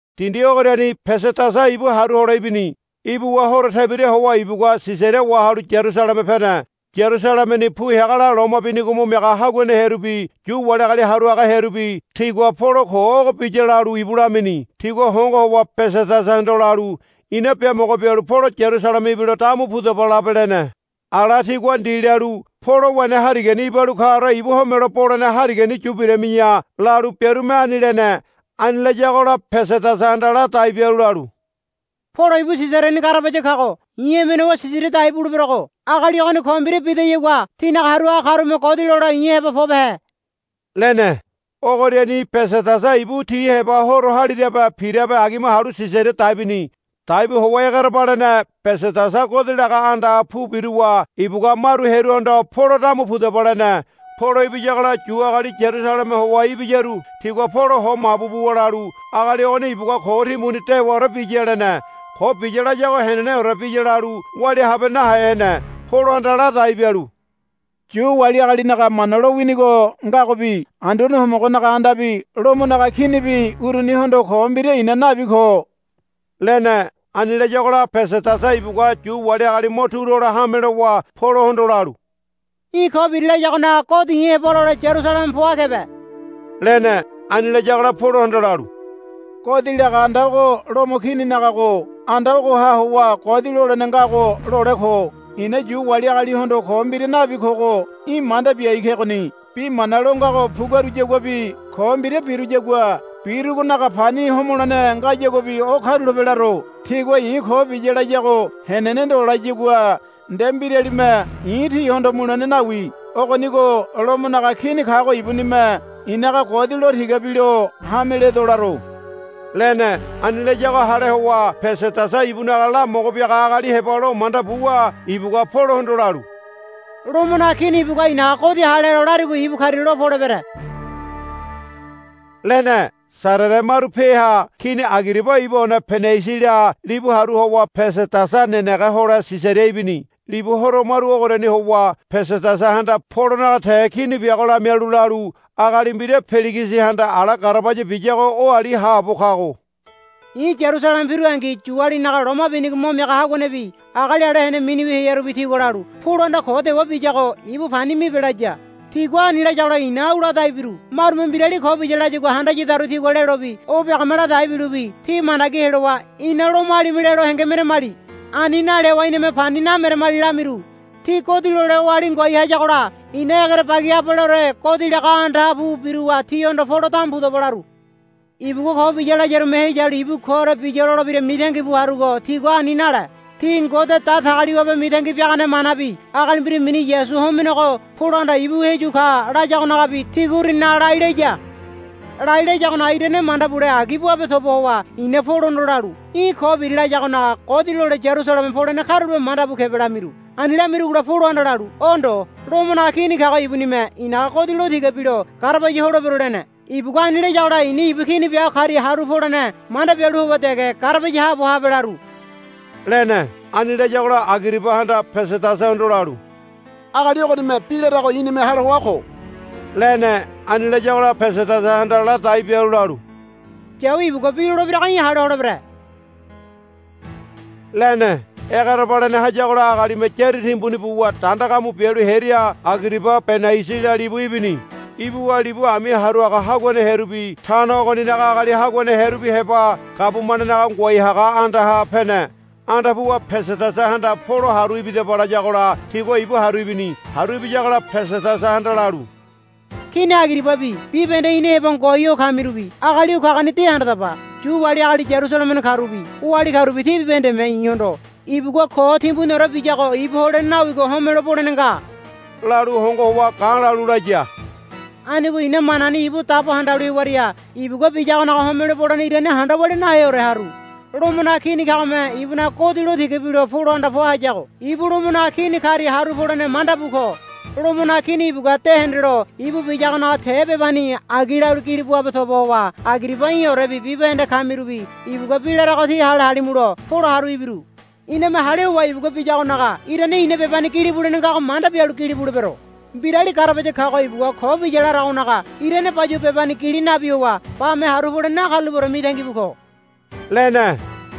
Dindi ogoriani Pesedasa ibu haru hole ibini. Ibuwa horo tebira howa ibugua Sisaria wahalu Yarusaleme pene. Yarusalemeni pu heagola loma binigo mo miaga haguane hearubi Yu wali agali haru haga hearubi tigua, Polo ko ogo biya, lalu ibu lamini. Tigua hongo howa Pesedasahondo lalu, Ina biamogo bialu Polo Yarusaleme ibilo, Damu pudaba labe, lene. Ala tigua ndi lalu, Polo wene harigani ibalu kaore ibu homelo bole harigani yu birami̱ya, lalu biarume ani lene. Ani layagola Pesedasahanda ladai bialu lalu, Polo ibu Sisariani garabaya kago. I̱ emene howa Sisaria dai buleberogo agali ogoni ko mbira bidayagua tínaga haru haga karume godi lole i̱ heba pobehe, lene. Ogoriani Pesedasa ibu ti heba horo halirabe pirabe agima halu Sisaria dai bini. Dai bu howa egerebalene Pesedasa godi laga andaha pu biruwa ibugua maru hearuhondo, Polo damu pudaba, lene. Polo ibiyagola Yu agali Yarusaleme howa ibiyaru tigua Polo ho mabu buwa lalu, Agali ogoni ibugua ko timbuni dewaore biya, lene. Ko biya layago heneneore biya lalu walia habe nahe hene. Polohanda ladai bialu, Yu wali agalinaga Mana lowinigo ngagobi Anduane Homogonaga andabi Lomonaga Kinibi urunihondo ko mbira i̱na nabi ko, lene. Ani layagola Pesedasa ibugua Yu wali agali mo turu hole hame lowa Polohondo lalu, Í̠ ko biri layagonaga godi i̱ heba lole Yarusaleme poa kebe, lene. Ani layagola Polohanda lalu, Godi laga anda ogo Lomo kininagago anda ogoha howa godi lolene ngago lole ko. I̱na Yu wali agalihondo ko mbira nabi kogo í̠ manda biai kegoni. Bi mana lo ngago puguaruyaguabi ko mbira biruyagua birugonaga pani homolene ngayaguabi o karulape laro. Tigua i̱ ko biya layago henene ndo layagua nde mbiralime i̱ tihondo mulene nawi. Ogonigo Lomonaga Kini kago ibunime i̱naga godi lo tiga bilo hame ledo laro, lene. Ani layago hale howa Pesedasa ibunaga lamogo biaga agali heba lo manda buwa ibugua Polohondo lalu, Lomonaga Kini ibugua i̱naga godi hale helo larigo ibu karia lo polebere, lene. Sarere maru peha Kini Agiriba ibu one Benaisila libugua turu howa Pesedasa nenege hole Sisaria ibini. Libu horo maru ogoriani howa Pesedasahanda Polonaga te kini biago lamialu lalu, Agali mbira Peligisihanda ala garabaya biyago oali haabo kago. I̱ Yarusaleme pirungi Yualinaga loma binigo mo miaga haguanebi agali ala hene miniwi hearubi tigua lalu, Polohanda ko dewa biyago ibu pani mibe, laya. Tigua ani layagola i̱na au ladai biru, Marume mbirali ko biya layagua handayadaru tigua lelobi o biagome ladai bilobi ti mandagi helowa ina Lomoalime lelo henge meramali. Ani nale howa iname pani nameramali, lamiru. Ti godi lole oali ngoai hayagola i̱na egerebagi abaleore godi laga andaha pu biruwa tihondo, Polo damu pudaba, laru. Ibugua ko biya layarume heyalu ibu koore biya lolebira mitangi bu harugo tigua ani nale. Ti Ngode Datagaliwabe mitangi biagane manabi agali mbira mini Yasu homenego Polohanda, Ibu heyu ka, layagonagabi tigua uruninaga lai laya. Lai layagonaga irane manda bule agi buabe toba howa i̱na Polohondo lalu, Í̠ ko biri layagonaga godi lole Yarusaleme polene karulape manda bu kebe, lamiru. Ani lamirugola Polohanda lalu, O ndo. Lomonaga Kini kago ibunime i̱naga godi lo tiga bilo garabaya holebero, lene. Ibugua ani layagola i̱na ibu kini biago karia haru polene manda bialu howa dege garabaya haabo habe laru, lene. Ani layagola Agiribahanda Pesedasahondo lalu, Agali ogonime bi larago i̱nime hale hoa ko, lene. Ani layagola Pesedasahanda ladai bialu lalu, Yawi ibugua bi lolebirago í̠ hale holebere, lene. Egerebalene hayagola agalime yári timbuni buwa danda gamu bialu hearia Agiriba Benaisila libu ibini. Ibuwa libu ami haru haga haguane hearubi tano ogoninaga agali haguane hearubi heba gabumanenaga ngoai haga andaha pene. Anda puwa Pesedasahanda, Polo haru ibidaba, layagola tigua ibu haru ibini. Haru ibiyagola Pesedasahanda lalu, Kini Agiribabi bibahende ina heba ngoai ho kamirubi agali o kagoni de handadaba. Yu wali agali Yarusalemeni karubi oali karubi ti bibahendeme i̱hondo, Ibugua ko timbuniore biyago ibu holene nawigo homelo bolene nga, lalu hongo howa ga̱ lalu laya. Anigo i̱na manani ibu dabo handalu hewaria ibugua biyagonaga homelo bolene irane handa walia naheore haru. Lomonaga Kini kagome ibunaga godi lo tiga bilo Polohanda poa hayago ibu Lomonaga Kini karia haru polene manda bu ko. Lomonaga Kini ibugua de hendelo ibu biyagonaga te bebani agi lalu gili buabe toba howa Agiriba í̠orebi bibahende kamirubi ibugua bi larago tí hale halimulo Polo haru ibiru. Iname hale howa ibugua biyadagonaga irane i̱na bebani gilibu wulene ngago manda bialu gili bulebero. Mbirali garabaya kago ibugua ko biya laragonaga irane bayuwa bebani gili nabi howa bame haru polene nakarulapeore mitangi bu ko, lene.